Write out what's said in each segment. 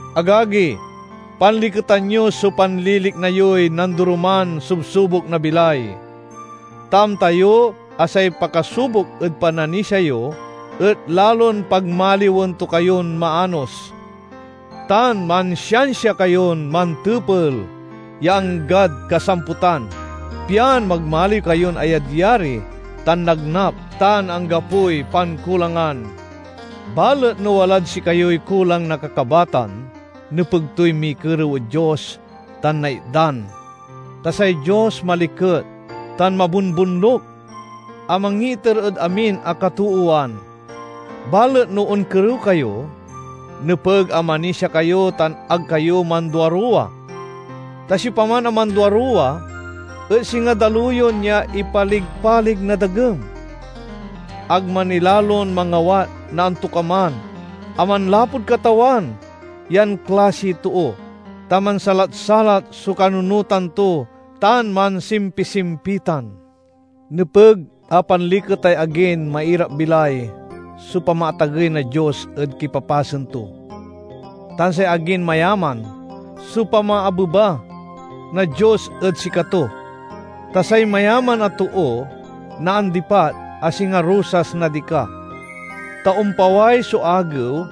Agagi, panliketan yo so panlilikna yoy nandoroman subsubok na bilay, ta amta yo a say pakasubok ed pananisia yo et lalon pagmaliwen to kayon maanos. Tan mansiansia kayon mantepel ya anggad kasamputan, pian magmaliw kayon ayadyari tan nagnap tan anggapoy pankulangan. Balet no walad sikayoy kulang na kakabatan, nepeg toy mikerew ed Dios tan naitdan, ta say Dios maliket tan mabonbonluk a mangiiter ed amin a katoowan. Balet no onkerew kayo, nepeg a manisia kayo tan ag kayo manduaruwa, ta siopaman a manduaruwa et singa daluyon ya ipaligpalig na dagem. Ag manilalon mangawat na antokaman a manlapud Katawan yan klasiy too, ta mansalat-salat so kanunotan to tan mansimpisimpitan. Nepeg a panliketay agin mairapbilay so pamaatagey na Dios ed kipapasen to, tan say agin mayaman so pamaabeba na Dios ed sikato, ta say mayaman a too naandipat a singa rosas na dika. Ta ompaway so agew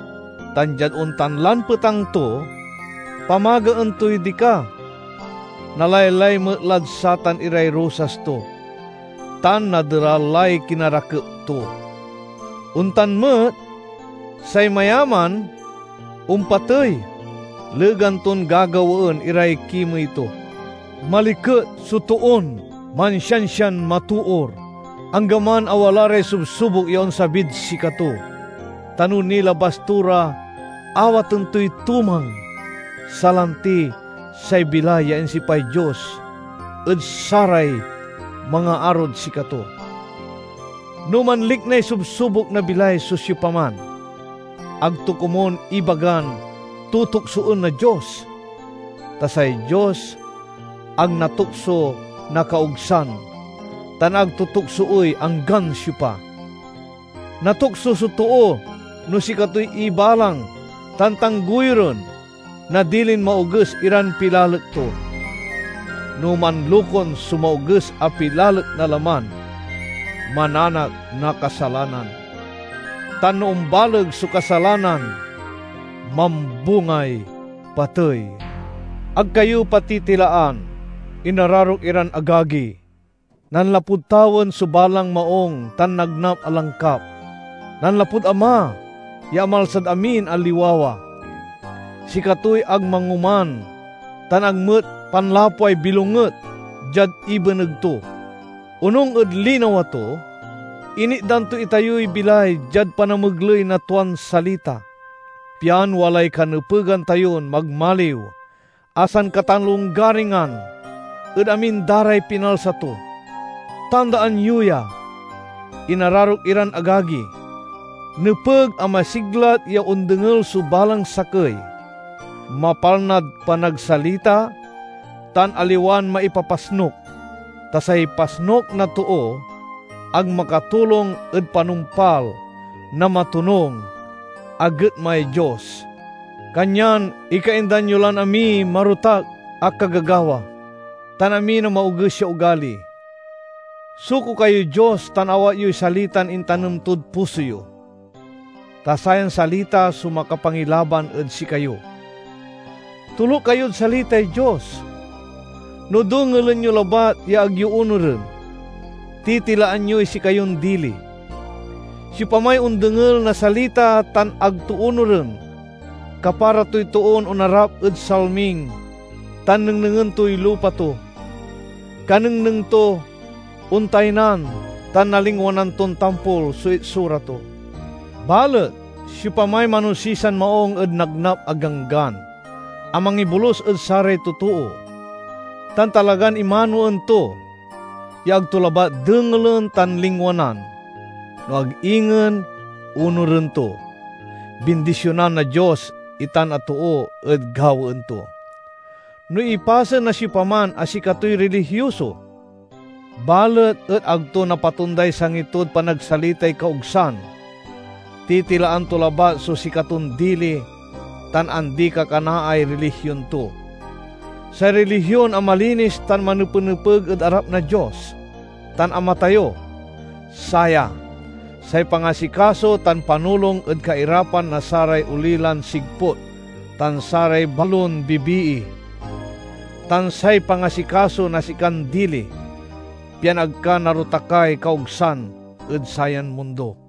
tan diad ontan lan petang to, pamagaen toy dika, nalaylay met lad satan iray rosas to, tan naderal lay kinarakep to. Ontan met, say mayaman ompatey legan ton gagawaen iray kimey to. Maliket so toon mansiansian matoor anggaman a wala ray subsubok ya onsabid sikato, ta no nilabas to ra awaten toy tumang, salanti say bilay ya insipay Dios ed saray mangaarod sikato. No manliknay subsubok na bilay so siopaman, ag to komun ibagan tutuksoen na Dios. Ta say Dios ag natukso na kaogsan tan ag to tuksoey anggan siopa. Natukso so too no sikatoy ibalang tan tangguyoren na dilin maoges iran pilalek to. No manlokun so maoges a pilalek na laman, mananak na kasalanan. Tan no ombaleg so kasalanan, mambungay patey. Ag kayo patitilaan, inararok iran agagi! Nanlapud tawen so balang maung tan nagnap a langkap; nanlapud Ama ya amalsad amin a liwawa. Sikatoy ag mangoman tan ag met panlapway bilonget diad ibeneg to. Onung ed linawa to, initdan to itayoy bilay diad panamegley na tuan salita, pian walay kanepegan tayon magmaliw a sankatalonggaringan ed amin da ray pinalsa to. Tandaan yo ya, inararok iran agagi! Nepeg a masiglat ya ondengel so balang sakey, mapalnad panagsalita, tan aliwan maipapasnuk. Ta say pasnuk na too ag makatulong ed panumpal na matonung a getmay Dios. Kanyan ikaindan yo lan amiy marotak a kagagawa, tan amin a maoges ya ogali. Suko kayod Dios tan awat yoy salitan intanem tod puso yo, ta sayan salita so makapangilaban ed sikayo. Toluk kayod salitay Dios. No dengelen yo labat ya ag yo onuren, titilaan yoy sikayon dili. Siopamay ondengel na salita tan ag to onuren, kapara toy toon onarap ed salming ta nengnengen toy lupa to. Kanengneng to, ontaynan tan nalingwanan ton tampol so itsura to. Balet siopamay manosisan maung ed nagnap a ganggan a mangibolus ed saray totoo, tan talagan imanoen to, ya ag to labat dengelen tan lingwanan, no ag ingen onuren to—bindisionan na Dios itan a too ed gawaen to. No ipasen na siopaman a sikatoy rilihioso, balet et ag to napatonday sangi tod panagsalitay kaogsan, titilaan to labat so sikaton dili tan andi-kakanaay rilihion to. Say rilihion a malinis tan manepenepeg ed arap na Dios tan Ama tayo, saya: say pangasikaso tan panulong ed kairapan na saray olilan sigput tan saray balon bibii, tan say pangasikaso na sikan dili, pian ag ka narotakay kaogsan ed sayan mundo.